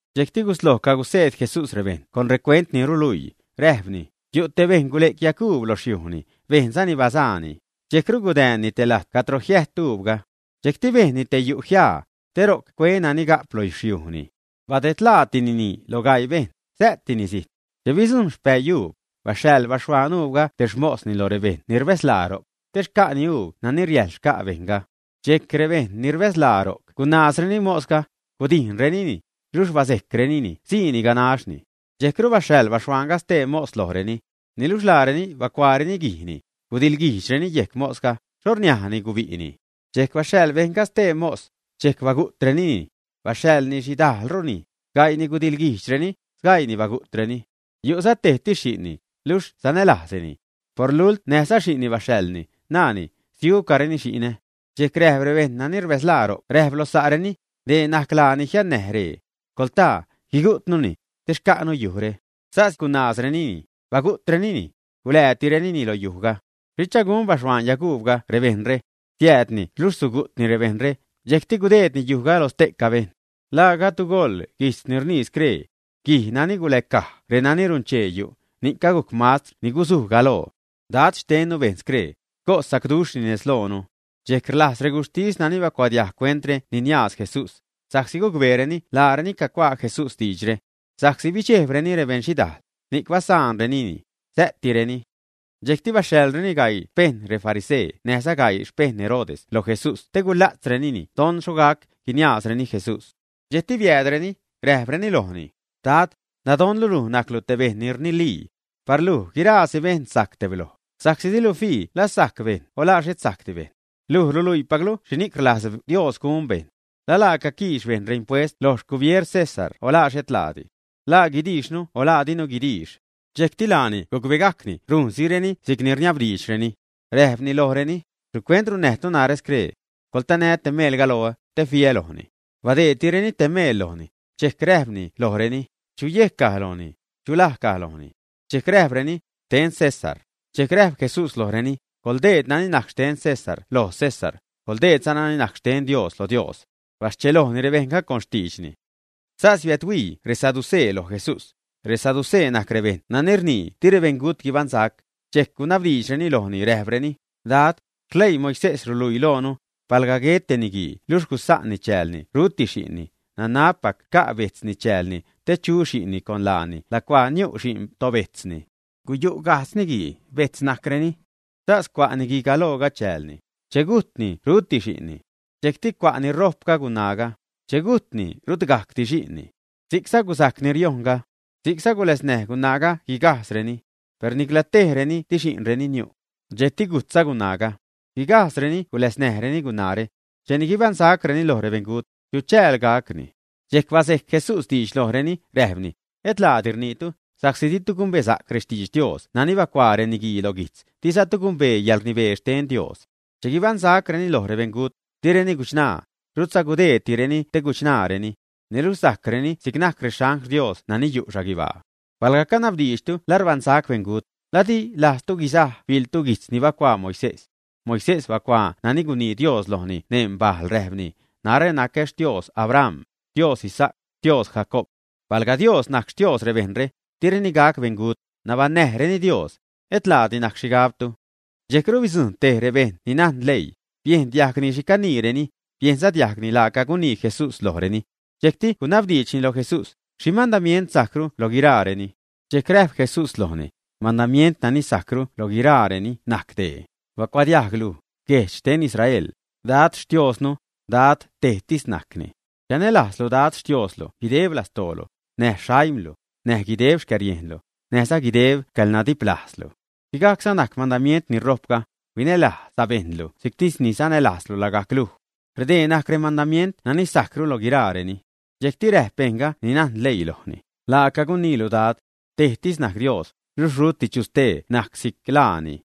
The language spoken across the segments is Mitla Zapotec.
Dxejcti gusloj caguseed Jesús rebejṉ con recuent ni ruluii, räjpni: ―Yu' te bejṉ bazuj yaguub loj xyujni, bejnzani bazaani, dxejcru gudäänni te lajt cadro jiä't uubga. Dxejcti bejnni te yu' jiaa, te ro'c cue nani ga'p lo xyujni. ’Badedlaatinini loj gaii bejṉ, sä'tini zijt. Che bidzujṉ xpäii uub, baxhaḻ baxhuaan uubga te xmosni loj rebejṉ ni rbäzlaa ro'c, te xca'ni uub nani riäjḻ xca' bejṉga. Dxejc rebejṉ ni rbäzlaa ro'c gunaazreni mosga, gudijnrenini, luxh bazejcrenini siini ganaxni. Dxejcru baxhaḻ baxhuaanga stee mos lojreni. Niluxh laareni bacuaareni guijni, gudiḻguijdxreni yejc mosga, xho rniajni gubi'ni. Dxejc baxhaḻ bejṉga stee mos, dxejc bagu'trenini. Baxhaḻni xhidajlrureni. Gaii gudiḻguijdxreni, sgaiini bagu'treni. ’Yu'za tejtis xi'nni, luxh sanälajznini. Por lult näjza xi'nni baxhaḻni, naani: “Siucareni xi'nä.” Dxejc rebejṉ nani rbäzlaa ro'c räjp loj sa'reni: “Dee najc laa ni jiannäj ree. Coḻtaa, guigu'tnuni, te xca'nu yujre.” Sas gunaazrenini, bagu'trenini. Guläätirenini lo yujga. ’¿Xhicha gun baxhuaan yaguubga rebejṉre? Siäädni luxh sugu'tni rebejṉre, dxejcti gudeedni yujga loj ste'ca bejṉ. ’¿La gajdtu goḻ guijtz ni rnii scree? Guij nani guläcaj renani runchee yu', ni'c agujc mastr ni guzuj galoo. Dad xtennu bejn scree, cos sacduxhni nezlojnu. Dxejc rlajz reguxhtis nani bacuadiajg cuentre niniaaz Jesús, sa'csi gucbeereni laareni cacuaa Jesús diidxre. Sa'csi bidxejbreni rebeṉxhidaal, ni'c basa'nrenini, sä'tireni. Dxejcti baxhaḻreni gaii xpejṉ refarisee näjza gaii xpejṉ Herodes loj Jesús te gula'tzreni don xho gac guiniaazreni Jesús. Dxejcti biäädreni, räjpreni lojni: ―Dad, nadonnu luj najclu te bejṉ ni rnilii. Par luj guiraasi bejṉ sajc tebloj, sa'csi dilu fii la sajc bejṉ o la xhet sajcdi bejṉ. Luj ruluiipaclu xhini'c rlajz Dios gun bejṉ. ¿La laaca quiix bejṉ reimpuest lo xcubieer César o la xhet laadi? ¿La guidiixnu o la dinu guidiix? Dxejcti laani gucbegajcni rujnsireni si'cni rniabdiidxreni. Räjpni lojreni: ―¿Xhicuent runnäjtu narä scree? Coḻtanä te meelga loä, te fiä lojni. Badeedtireni te meel lojni, dxejc räjpni lojreni: ―¿Chu yejc caj lojni, chu laj caj lojni? Dxejc räjpreni: ―Xten César. Dxejc räjp Jesús lojreni: ―Coḻdeed nani najc xten César loj César; coḻdeedza nani najc xten Dios loj Dios. Baschelojni rebejṉga con xtiidxni. Sas biädhuii resaducee loj Jesús. Resaducee najc rebejṉ nani rnii di rebeṉgut guibaṉsac. Dxejc gunabdiidxreni lojni, räjpreni: ―Dad, xleii Moisés ruluii loonu, palga guet te niguii luxh gusa'nni chäälni ruti xi'nni, nanabpac xca' bejtzni chäälni, te chu xi'nni con laani lacua niu' xi'n tobejtzni. Guyu' gajdz niguii, bejtz najcreni. Sas cua' niguigalooga chäälni. Che gujtni ruti xi'nni. Dxejcti cua' ni rojpga gunaaga. Che gujtni, rut gajcdi xi'nni. Si'cza gusajc ni riojnga. Si'cza guläznäj gunaaga guigajdzreni. Per nicla tej reni di xi'nreni niu'. Dxejcti gujtza gunaaga. Guigajdzreni guläznäjreni gunaare. Cheni guibaṉsacreni lo rebeṉgut, ¿chu chääl gacni? Dxejc bazejc Jesús diidx lojreni, räjpni: ―Et laadi rniitu, sa'csi ditu gumbesa'c rextidx Dios nani bacuaa reniguii lo guijtz, dizatu gumbee yäḻrnibee xten Dios. Che guibaṉsacreni loj rebeṉgut, direni guchṉaa, rutza gudeedtireni te guchṉaareni. Niluxh sajcreni si'c najc rexangl Dios nani yu' xhaguibaa. Palga canabdiidxtu la rbaṉsac rebeṉgut, ¿la di lajztu guisaj biḻtu guijtz ni bacuaa Moisés? Moisés bacuaa nani gunii Dios lojni neṉ bajl, räjpni: “Narä nacä Xtios Abraham, Xtios Isaac, Xtios Jacoob.” Palga Dios najc Xtios rebejṉre, direni gac beṉgut, nabaṉnäjreni Dios. Et laadi najc xhigabtu. Dxejcru bidzujṉ tej rebejṉ ni najn leii, biejn diajgni xhi caniireni, biejnza diajgni laaca gunii Jesús lojreni. Dxejcti gunabdiidxni loj Jesús: ―¿Xhi mandamient sajcru lo guiraareni? Dxejc räjp Jesús lojni: ―Mandamient nani sajcru loj guiraareni najc dee: “Bacuadiajg luj, guejdx xten Israel, Dad Xtiosnu, Dad tejtis najcni. Chanälajzlu Dad Xtioslu guideb lastoolu, näj xaimlu, näj guideb xcäriejnlu, näjza guideb xcäḻnadiplajzlu.” Sigajcza najc mandamient ni ṟojpga: “Huinälajz sabejṉlu si'ctis sanälajzlu lagajc luj.” Redee najc remandamient nani sajcru loj guiraareni. Dxejcti räjp bejṉga ni najn leii lojni: ―Laaca guniilu Dad. Tejtis najc Dios, luxh ruti chu stee najc si'c laani.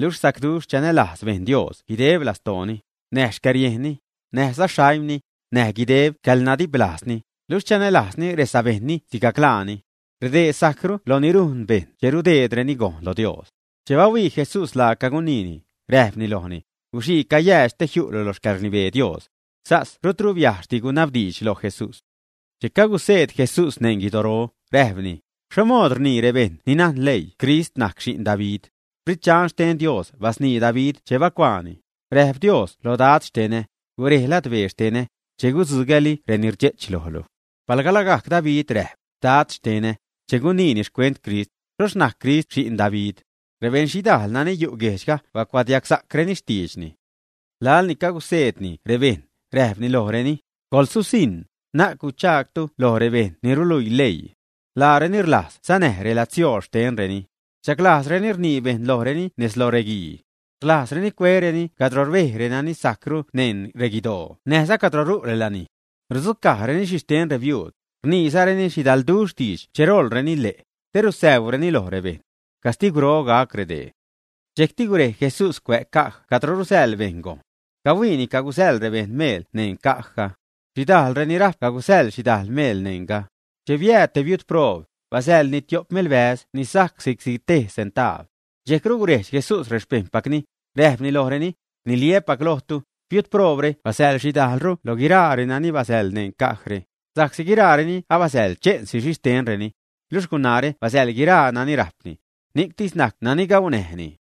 Luxh sacduxh chanälajz bejṉ Dios guideb lastooni, näj xcäriejnni, näjza xaimni, näj guideb xcäḻnadiplajzni, luxh chanälajzni resabejṉni sigajc laani. Redee sajcru loj ni rujn bejṉ che rudeedreni gojn lo Dios. Che bahuii Jesús laaca guniini, räjpni lojni: ―Guxii cayäädx te jiu'lu loj xcäḻrnibee Dios. Sas rutru biajxhdi gunabdiidx loj Jesús. Che caguseed Jesús neṉ guidoro, räjpni: ―¿Xho mood rnii rebejṉ ni najn leii Crist najc xi'n David? Sprit Dxan xten Dios basnii David che bacuaani: Räjp Dios loj Dad xtenä: “Gurej ladbee xtenä, che gudzugäli reni rdxe'ch lojlu.” Palga lagajc David räjp: “Dad, xtenä”, che guniini xcuent Crist, ¿xhoxh najc Crist xi'n David? Rebeṉxhidaal nani yu' guejdxga bacuadiagsa'creni xtiidxni. Laḻni caguseedni rebejṉ, räjpni lojreni: ―Coḻsusiṉ, na'c gu'chtu loj rebejṉ ni ruluii leii. Laareni rlajz sanäj reladsiool xtenreni. Rdxaglajzreni rnii bejṉ lojreni nez lo reguii. Rlajzzareni cuereni cadro rbej renani sajcru neṉ reguidoo näjza cadro ru' relanij. Rudzucajzareni xhixten rebiuud, rniizareni xhidalduxh diidx che roḻreni ḻe', te rusäuureni loj rebejṉ. Castigwroru gac redee. Dxejcti gurej Jesús cuä' caj cadro rusäḻ bejṉ gojn. Cahuiini cagusäḻ rebejṉ meel neṉ cajga. Xhidajl reni rajp cagusäḻ xhidajl meel neṉga. Che biääd te biud proob, basäḻni tiop melbäz ni sajc si'cti tej centaab. Dxejcru gurejdx Jesús rexpejṉpacni, räjpni lojreni: ―Rniliä́pac lojtu, biud proobre basäḻ xhidajlru lo guiraa renani basäḻ neṉ cajre, sa'csi guiraareni abasäḻ che'nsi xhixtenreni. Luxh gunaare basäḻ guiraa nani rajpni. Ni'ctis najc nani gaunäjni.